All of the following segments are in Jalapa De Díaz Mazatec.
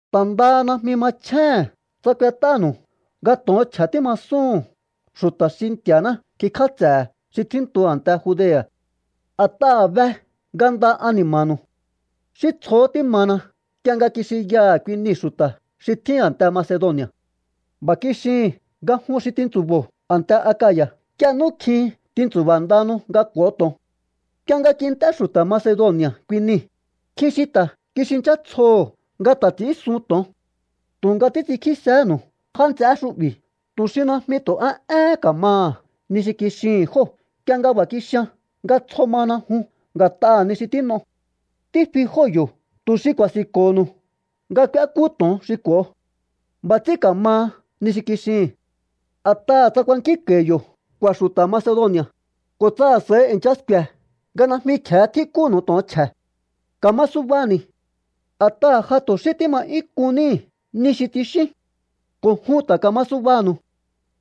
Ta̱ ndaha najmi machjéhe̱n tsa kuet'ánu̱u nga to̱on chje̱ tímasúhu̱n xu̱ta̱ xi Nti̱a̱ná kikj'áts'e̱he̱ xi tjíntu a̱nte Judea̱. A̱t'aha̱ be nga nda ani̱ma̱nu̱u. Xí tsjohó tímana nk'ie nga kixinyaha̱ kui nii̱ xu̱ta̱ xi tjín a̱nte Macedoni̱a̱. B'a̱ kixihi̱n nga jun xi tintsu̱bo̱o a̱nte Akaya̱ nk'ie nú kjin tintsu̱ba̱ ndahanu nga k'u̱o to̱on. Nk'ie nga kint'é xu̱ta̱ Macedoni̱a̱ kui nii̱, nkjin xi ta̱ kixinchá tsjoho̱ nga ta̱ ts'i̱ínsun to̱on. Tu̱nga títs'inkjísehénu̱u já nts'eé xu'bi̱ tu̱ xi najmi tu̱ a éhén ka̱maha ni xi kixihi̱n jóo̱ nk'ie nga b'a̱ kixian nga tsjo mana jun nga̱t'aha̱ ni xi tín'o. Tífi jóo̱ yo̱ tu̱ xi ku̱a̱si̱nko̱ho̱nu̱u nga k'úékú to̱on xi k'u̱o. B'a̱ ts'ín ka̱maha ni xi kixihi̱n. A̱t'aha̱ tsa kuankínko̱i̱ yo̱ k'u̱a̱ xu̱ta̱ Macedoni̱a̱, ko̱ tsa a̱s'a̱ihi i̱ncha sku̱e̱ nga najmi kje̱e tjíkúnu̱u to̱on chje̱, ka̱ma subani̱. A̱t'aha̱ ja tu̱ xí tíma 'yún k'un níi̱ ni xi tsixíún. Ko̱ jun ta̱ ka̱ma subanu̱u.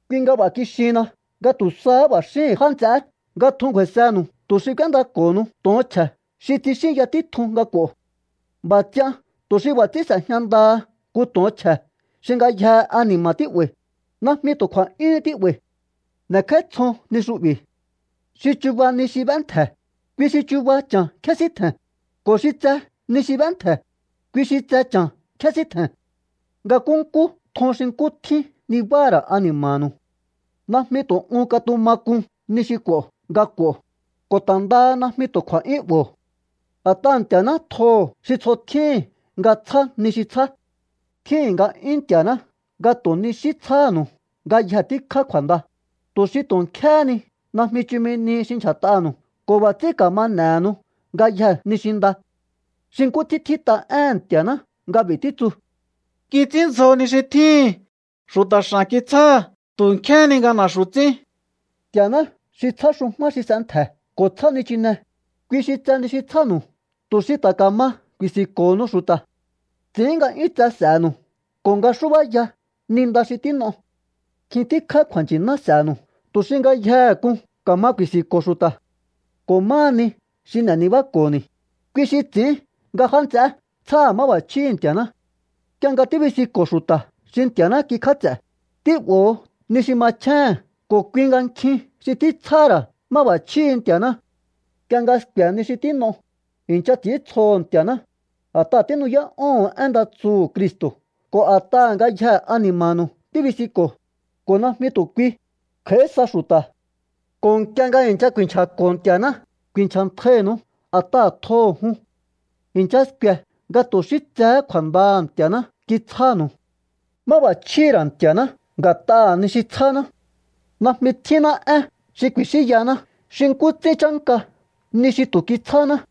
Kui nga b'a̱ kixihinna nga tu̱ sahá b'a̱ xíhi̱n já nts'eé nga tjun ngju̱a̱i̱sehe̱nu̱u tu̱ xi k'u̱éndako̱ho̱nu̱u to̱on chje̱ xi tsixínya títjun nga k'u̱o. B'a̱ ts'ian tu̱ xi b'a̱ ts'ín s'e̱jña ndaha nku to̱on chje̱ xi ngayjee̱ ani̱ma̱ tí'ba̱i̱, najmi tu̱ kju̱a̱'yúhún tí'ba̱i̱. N'e̱kj'áítsjon ni xu'bi̱. Xi chuba ni xi b'éntje̱, kui xi chuba cha̱n kjesíntje̱n, ko̱ xi tse ni xi b'éntje̱, kui xi tse cha̱n kjesíntje̱n. Nga nkúnkú tjon xi nkú tjín nibáha̱ ra̱ ani̱ma̱nu̱u. Najmi tu̱ un katuma k'un ni xi k'u̱o nga k'u̱o, ko̱ ta̱ ndaha najmi tu̱ kju̱a̱'yún 'bo̱o. A̱t'aha̱ Nti̱a̱ná tjoho̱ xi tsjo tjíhi̱n nga tsjá ni xi tsjá. Tjíhi̱n nga'yún Nti̱a̱ná nga tu̱ ni xí tsjáhánu̱u ngayje tíkjá kju̱a̱nda, tu̱ xi tu̱ nkjéhé nihi najmi chumi nihi xi ndyja̱t'aha̱nu̱u ko̱ b'a̱ ts'ín ka̱ma n'e̱henu ngayjee̱ ni xi nda. Xi nkú ts'ín tjít'a éhe̱n Nti̱a̱ná nga b'i̱ títsu: Kits'ínndzjo ni xi tjíhi̱n, xu̱ta̱ x'a̱n kitsjáha̱. Tu̱ nkjéhé ni nga na̱xu̱ ts'ín. Nti̱a̱ná xi tsjá xu̱jmá xi s'entje̱ ko̱ tsjá nichine, kui xi tse ni xi tsjánu̱u tu̱ xi ta̱ ka̱ma ku̱i̱si̱nko̱ho̱nu̱u xu̱ta̱. Ts'i̱ín nga 'yún tse s'e̱nu̱u ko̱ nga xúbáya ni nda xi tín'o. Nkjin tíkjá kju̱a̱nchi̱ná s'e̱nu̱u tu̱ xi ngayjehe k'un ka̱ma ku̱i̱si̱nko̱o xu̱ta̱. Ko̱ máha ni xi n'e̱ nibáko̱ni̱, kui xi ts'i̱ín nga já nts'eé tsjáha̱ máb'a̱chjíhi̱ Nti̱a̱ná. Nk'ie nga tíbisinko̱o xu̱ta̱ xi Nti̱a̱ná kikj'áts'e̱, tí'bo̱ho̱ ni xi machjéhe̱n ko̱ kui nga nkjin xi títsjáha̱ ra̱ máb'a̱chjíhi̱ Nti̱a̱ná. Nk'ie nga sku̱e̱ ni xi tín'o, i̱ncha ts'i̱íntsjoho̱ Nti̱a̱ná, a̱t'aha̱ tínu'yá'óho̱on én nda tsuhu̱ Cristo̱ ko̱ a̱t'aha̱ ngayje ani̱ma̱nu̱u tíbisinko̱o, ko̱ najmi tu̱ kui, kj'a̱í sa xu̱ta̱. Ko̱ nk'ie nga i̱ncha ku̱i̱nchja̱ko̱ Nti̱a̱ná, ku̱i̱nchja̱ntjainu̱u a̱t'aha̱ tjoho̱ jun. I̱ncha sku̱e̱ nga tu̱ xí tsehé kju̱a̱ndaha̱ Nti̱a̱ná kitsjánu̱u. ¡Máb'a̱chjíhi̱ ra̱ Nti̱a̱ná nga̱t'aha̱ ni xi tsjáná! ¡Najmi tjínná én xi ku̱i̱xínyahaná xi nkú ts'ín chánka ni xi tu̱ kitsjáháná!